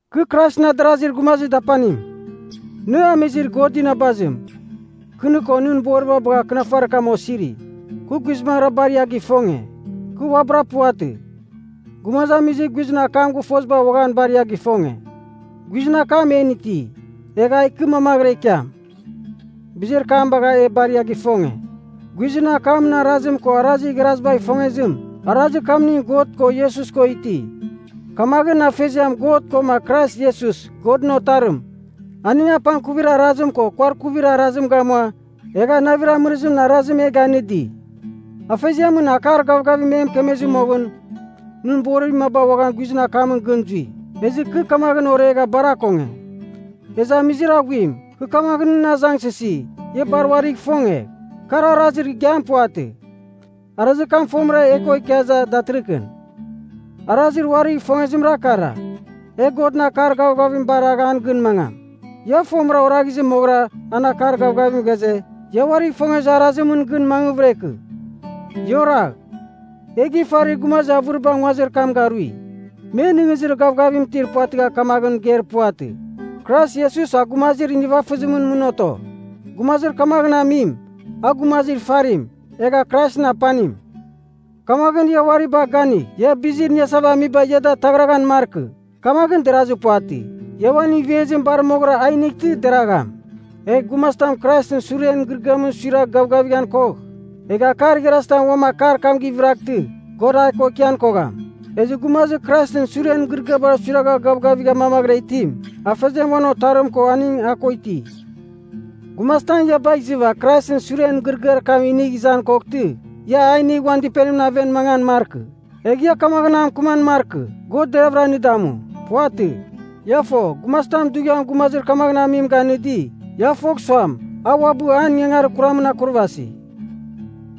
Kɨ Kraisɨn adarazir gumazir dapanim. Nɨ amizir God inabazim, kɨ nɨ ko nɨn boriba bagha akɨnafarir kam osiri. Kɨ guizbangɨra bar ia gifonge. Kɨ uabɨra puvatɨ, gumazamizir guizɨn akam gɨfoziba uaghan bar ia gifonge. Guizɨn akam en iti, egh a ikɨ mamaghɨra ikiam. Bizir kam bagha e bar ia gifonge. Guizɨn akamɨn arazim ko arazir igharazibagh ifongezim, arazir kamning God ko Iesus ko iti. Kamaghɨn Afeziam God koma Krais Iesus, Godɨn Otarim, aning apangkuvir arazim ko kuarkuvir arazim gamua, egha navir amɨrɨzimɨn arazim e ganɨdi. Afeziamɨn akar gavgavim e mɨkemezɨ moghɨn, nɨn borir maba guizɨn akamɨn gɨn zui. Ezɨ kɨ kamaghɨn oregha bar akonge. Ezɨ Amizir Aghuim, kɨ kamaghɨn nɨn azangsɨsi, ia bar uarigh ifongegh. Kar arazir igiam puvatɨ. Arazir kam fomɨra e ko ikia iza datɨrɨkɨn. Arazir uarigh ifongezimra kara: e Godɨn akar gavgavim baragh an gɨn mangam. Ia fomɨra oraghizɨ moghɨra an akar gavgavim ghaze, ia uarigh ifongezir arazimɨn gɨn mangvɨra ikɨ. Ia oragh. E gifarir gumazir avɨriba nguazir kam garui. Me nɨghnɨzir gavgavim itir puvatɨgha kamaghɨn mɨgeir puvatɨ, Krais Iesus a gumazir nivafɨzimɨn mɨn oto. Gumazir kamaghɨn amim, a gumazir ifarim, egha Kraisɨn Apanim. Kamaghɨn ia uari bagh ganigh, ia bizir iniasava amiba ia da ataghraghan markɨ. Kamaghɨn derazɨ puvatɨ. Ia uan ivezim bar moghɨra a inightɨ, deragham. Egh gumazitam Kraisɨn suren mɨgɨrɨgɨamɨn suiragh gavgavighan kogh, egh akar igharazitam uam akar kam gɨvɨraghtɨ, God a ko ikian kogham. Ezɨ gumazir Kraisɨn suren mɨgɨrɨgɨamɨn suiragha gavgavigha mamaghɨra itim, Afeziam uan Otarim ko aning a ko iti. Gumazitam ia bagh izɨva Kraisɨn suren mɨgɨrɨgɨar kam inigh izan koghtɨ, ia a inigh uan dɨpenimɨn aven mangan markɨ. Egh ia kamaghɨn a mɨkɨman markɨ, God deravɨra nɨ damu. Puvatɨ. Ia fo, gumazitam dughiam gumazir kamaghɨn amim ganɨdi, ia fogh suam, a uabɨ an ingangarir kuramɨn akurvasi.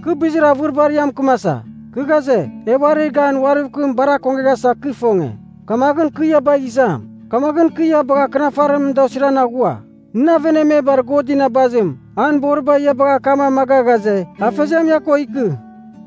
Kɨ bizir avɨribar ia mɨkɨmasa. Kɨ ghaze, e uarir gan uariv kɨm bar akongeghasa kɨ ifonge, kamaghɨn kɨ ia bagh izam. Kamaghɨn kɨ ia bagha akɨnafarimɨn da osiran aghua. Nɨn avenemebar God inabazim, an boriba ia bagha akam amaga ghaze, Afeziam ia ko ikɨ.